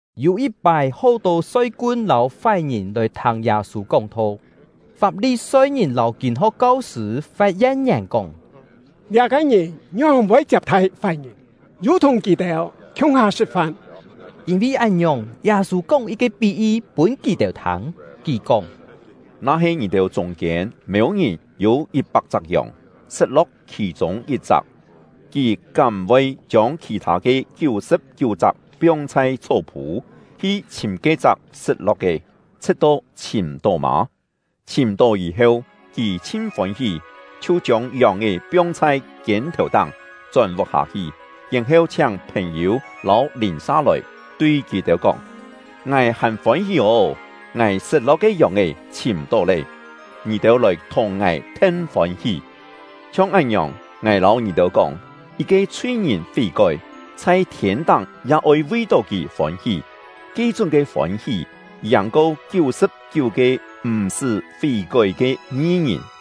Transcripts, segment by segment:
Yû yit-pái, hó-tô soi-kun lâu fái-ngìn lòi thâng Yâ-sû kóng-tho. Fap-li-soi-ngìn lâu kîn-ho̍k kau-sṳ̂ fat yen-ngièn kóng: “Liá-ke ngìn ngióng-voi chiap-thai fái-ngìn, yu thùng kì-têu khiung-ha sṳ̍t-fan!” Yîn-vi án-ngiòng, Yâ-sû kóng yit-ke pí-yi pûn kì-têu thâng; kì kóng: “Na-he ngì-têu chûng-kiên mêu-ngìn yû yit-pak-chak yòng, sṳt-lo̍k khì-chûng yit-chak, kì kám m̀-voi chiông khì-thâ ke kiú-sṳ̍p-kiú-chak piong chhai chhó-phû, hi chhìm ke-chak sṳt-lo̍k ke, chhṳ̍t-to chhìm-tó mâ? Chhìm-tó yî-heu, kì chhin fôn-hí, chhiu chiông yòng-è piong chhai kiên-thèu-táng, chón vuk-hâ hi, yèn-heu chhiáng phèn-yû lâu lìn-sa lòi, tui kì-têu kóng: ‘Ngài hàn fôn-hí ô! Ngài sṳt-lo̍k ke yòng-è chhìm-tó lé! Ngì-têu lòi thùng ngài then fôn-hí!’ Chhiong án-ngiòng, ngài lâu ngì-têu kóng, yit-ke chhui-ngìn fí-kói, chhai thiên-táng ya oi vi-tó kì fôn-hí; ke-chúng ke fôn-hí, yàng-ko kiú-sṳ̍p-kiú-ke m̀-sṳ́ fí-kói ke ngi-ngìn!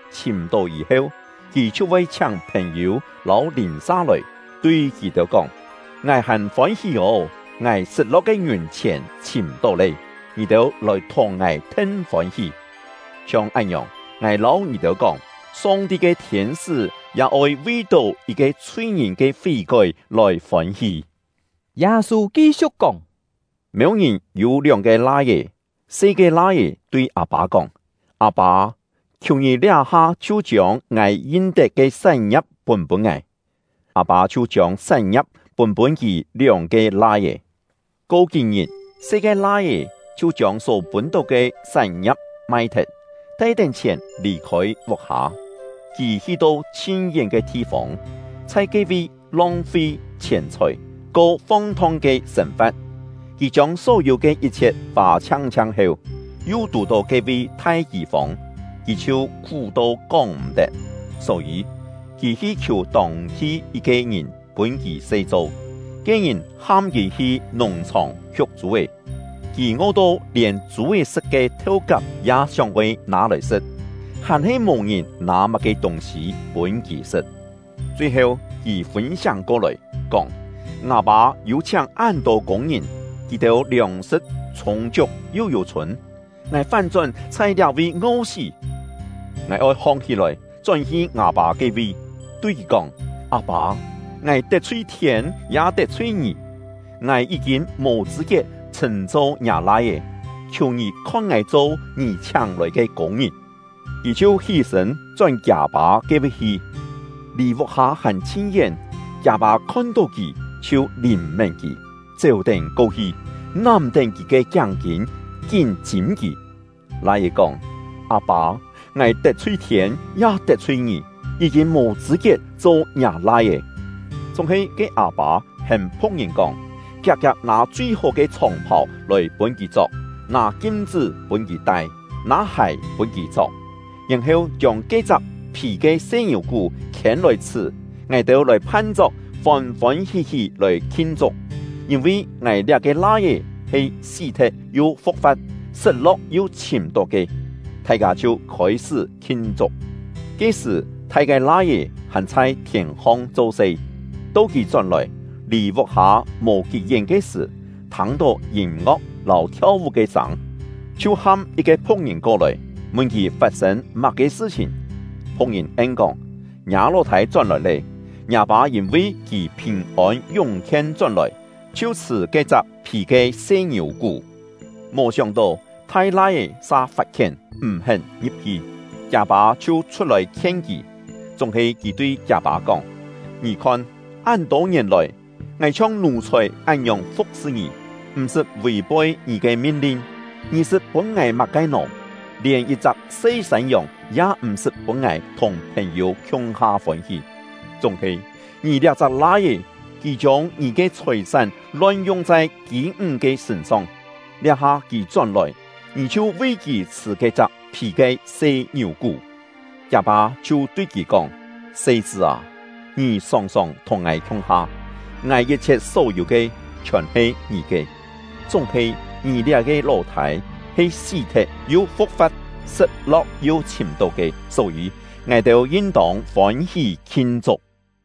Chhìm-tó yî-heu, kì chhiu voi chhiáng phèn-yû lâu lìn-sa lòi, tui kì-têu kóng: ‘Ngài hàn fôn-hí ô! Ngài sṳt-lo̍k ke ngiùn-chhièn chhìm-tó lé! Ngì-têu lòi thùng ngài then fôn-hí!’ Chhiong án-ngiòng, ngài lâu ngì-têu kóng, Song-ti ke thiên-sṳ́ ya oi vi-tó yit-ke chhui-ngìn ke fí-kói lòi fôn-hí.” Yâ-sû ki-siu̍k kóng: “Mêu-ngìn yû lióng-ke lai-é. Se ke lai-é tui â-pâ kóng: ‘Â-pâ, khiù ngì liá-ha chhiu chiông ngài yin-tet ke sán-ngia̍p pûn-pûn ngài.’ Â-pâ chhiu chiông sán-ngia̍p pûn-pûn kì lióng-ke lai-é. Ko kí-ngit, se ke lai-é chhiu chiông só pûn-tó ke sán-ngia̍p mai-thet, tai-tén chhièn lì-khôi vuk-hâ. Kì hi-to chhin-yén ke thi-fông, chhai ke-vi long-fi chhièn-chhòi, ko fong-thong ke sên-fa̍t. Kì chiông só-yû ke yit-chhiet fâ chhiang-chhiang heu, yu tù-tó ke-vi thai kî-fông, kì chhiu khú-to kóng-m̀-tet. Só-yî, kì hi khiù tông-thi yit-ke ngìn pûn kì se cho; ke-ngìn ham kì hi nùng-chhòng hiuk chû-é. Kì ngo-to lièn chû-é sṳ̍t ke theu-kap ya sióng-oi nâ-lòi sṳ̍t; hàn-he mò-ngìn nâ má-ke tûng-sî pûn kì sṳ̍t. Chui-heu, kì fûn-siáng ko-lòi, kóng: ‘Ngâ pâ yû chhiáng án-tô kûng-ngìn, kì-têu liòng-sṳ̍t chhûng-chiuk yu yû-chhûn, ngài fán-chón chhai liá-vi ngo-sí! Ngài oi hong-hí-lòi, chón-hi ngâ-pâ ke-vi, tui kì kóng: Â-pâ, ngài tet-chhui thiên, ya tet-chhui ngì. Ngài yí-kîn mò chṳ̂-kiet chhṳ̂n-cho ngiâ lai-é; khiù ngì khon ngài cho ngì chhiáng-lòi ke kûng-ngìn.’ Kì chhiu hí-sṳ̂n chón kiâ-pâ ke-vi hi. “Lì vuk-hâ hàn chhin-yén, kiâ-pâ khon-tó kì, chhiu lìn-mén kì, chéu-tén ko-hi, nám-tén kì ke kiáng-kîn, kín chîm kì. Lai-é kóng: ‘Â-pâ, ngài tet-chhui thiên, ya tet-chhui ngì; yí-kîn mò chṳ̂-kiet cho ngiâ lai-é!’ Chúng-he ke â-pâ hêm phu̍k-ngìn kóng: ‘Kiak-kiak nâ chui-hó ke chhòng-phàu lòi pûn kì chok, nâ kim-chṳ́ pûn kì tai, nâ hài pûn kì chok, yèn-heu chiông ke-chak phì ke se ngiù-kú khiên-lòi chhṳ̀. Ngài-têu lòi phan-chok, fôn-fôn hí-hí lòi khin-chuk! Yîn-vi ngài liá-ke lai-é he sí-thet yu fu̍k-fa̍t, sṳt-lo̍k yu chhìm-tó ke.’ Thai-kâ chhiu khôi-sṳ́ khin-chuk. “Ke-sṳ̀, thai ke lai-é hàn chhai thièn-hong cho-se; to kì chón-lòi, lì vuk-hâ mò kí-yén ke sṳ̀, thâng-tó yîm-ngo̍k lâu thiau-vú ke sâng, chhiu ham yit-ke phu̍k-ngìn ko-lòi, mun kì fat-sên má-ke sṳ-chhìn. Phu̍k-ngìn en-kóng: ‘Ngiâ ló-thâi chón-lòi lé! Ngiâ pâ yîn-vi kì phìn-ôn yúng-khien chón-lòi, chhiu chhṳ̀ ke-chak phì ke se ngiù-kú.’ “Mò sióng-tó, thai lai-é sa fat-khién, m̀-hén ngi̍p-hi; kiâ-pâ chhiu chhut-lòi khien kì. Chúng-he kì tui kiâ-pâ kóng: ‘Ngì khon, án-tô ngièn lòi, ngài chhiong nù-chhòi án-ngiòng fu̍k-sṳ ngì, m̀-sṳt vì-poi ngì ke min-lin, ngì sṳt pûn ngài má-ke nò? Lièn yit-chak se sân-yòng ya m̀-sṳt pûn ngài thùng phèn-yû khiung-ha fôn-hí. Chúng-he ngì liá-chak lai-é, kì chiông ngì ke chhòi-sán lon-yung chhai kî-ńg ke sṳ̂n-song; liá-ha kì chón-lòi, ngì chhiu vi kì chhṳ̀ ke-chak phì ke se ngiù-kú!’ Kiâ-pâ chhiu tui kì kóng: ‘Se-chṳ́ â, ngì sòng-sòng thùng ngài khiung-ha, ngài yit-chhiet só-yû ke, chhiòn he ngì ke. Chúng-he ngì liá-ke ló-thâi he sí-thet yu fu̍k-fa̍t, sṳt-lo̍k yu chhìm-tó ke; só-yî, ngài-têu yin-tông fôn-hí khin-chuk.’”